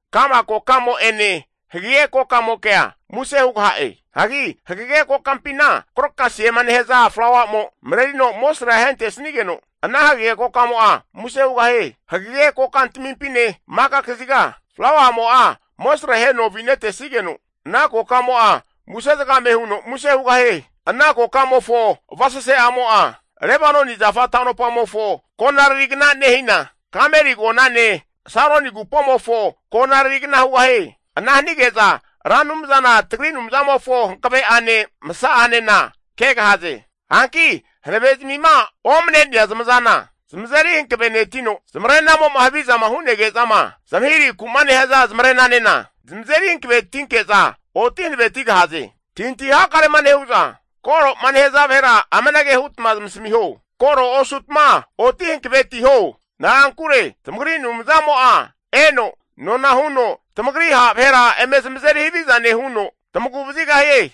Ka'ma kokamo'ene hagege kokamokea muse hugaha'e. Hagi hagege kokampina krokasiema nehaza flauamo marerino amosrea ahentesnigeno, ana hagege kokamo'a muse hugahie. Hagege kokantamimpine maka kaziga flauamo'a amosre aheno avinetesigeno, ana kokamo'a muse zagame huno muse hugahie. Ana kokamofo avasase'amo'a, Lebanoni zafa ta'nopamofo konaririgna nehina, Kameli agonane Saroni agupomofo konaririgna hugahie. Ana hanige'za Ra Anumzana tagri Anumzamofo hankave'ane masa'anena kegahaze. Hanki hanavezmima omne'nea zamazana zamazeri hankavenetino, zamarenamo'ma havizama hunege'zama zamahirahiku'ma nehaza zamare'nanena zamazeri hankavetinke'za oti hankavetigahaze. Antahintahi hakarema nehu'za koroma nehaza vahera amanage hutma zamasamiho. Koro osutma oti hankavetiho. Na'ankure tamagri Anumzamo'a eno nona huno tamagri ha' vahera eme zamazeri haviza nehuno, tamagu vazigahie.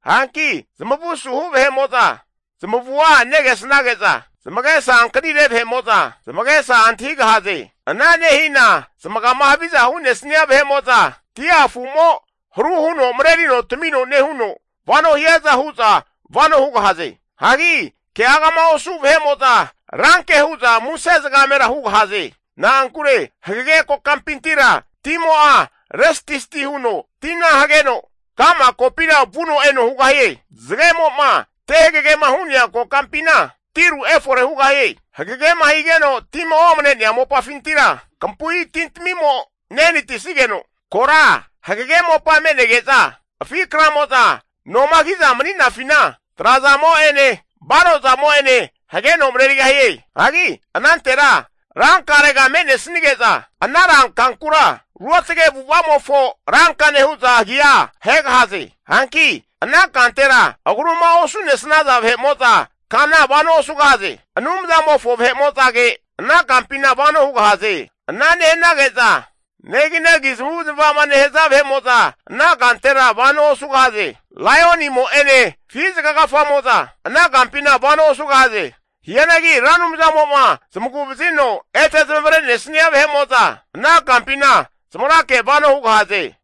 Hanki zamavu asuhu vahe'mo'za zamavua negesnage'za, zamagesa ankanire vahe'mo'za, zamagesa antahigahaze. Ana nehina zamagama haviza hu'nesnia vahe'mo'za, dia afu'mo haru huno marerino tamino nehuno vano hiaza hu'za vano hugahaze. Hagi keagama osu vahe'mo'za ranke hu'za muse zagamera hugahaze. Na'ankure hagege kokampintira timo'a restisti huno tina hageno ka'ma kokampina vuno eno hugahie. Zagemo'ma te hagegema hu'nea kokampina tiru efore hugahie. Hagegema higeno tima omane'nea mopafintira, kampui tintamimo nehanatisnigeno, kora hagege mopa me'nege'za afi kramo'za nomagi'za mani'nafina, trazamo'ene barozamo'ene hageno marerigahie. Hagi anantera rankarega me'nesnige'za, ana rankankura Ruotage Avu'ava'mofo Rankane hu'za agia ahegahaze. Hanki ana kantera agruma osu'nesnaza vahe'mo'za kana vano osugahaze. Anumzamofo vahe'mo'zage ana kampina vano hugahaze. Ana nehanage'za neginagi zamavu zamava'ma nehaza vahe'mo'za ana kantera vano osugahaze. Laionimo'ene afi zaga kafamo'za ana kampina vano osugahaze. Hianagi Ra Anumzamo'ma zamagu vazino ete zamavare'nesnia vahe'mo'za ana kampina zamagrake vano hugahaze.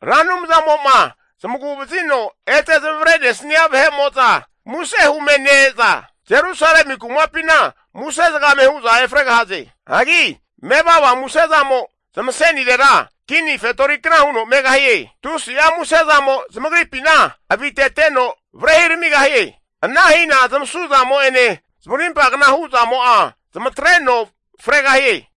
Ra Anumzamo'ma zamagu vazino ete zamavare nesnia vahe'mo'za muse hume ne-eza, Jerusalemi kumapina muse zagame hu'za efregahaze. Hagi mevava musezamo zamasenirera kini fetorikna huno megahie. Tusi'a musezamo zamagripina aviteteno varehi ramigahie. Ana hina zamasu zamo'ene zamarimpa kna hu'zamo'a zamatreno fregahie.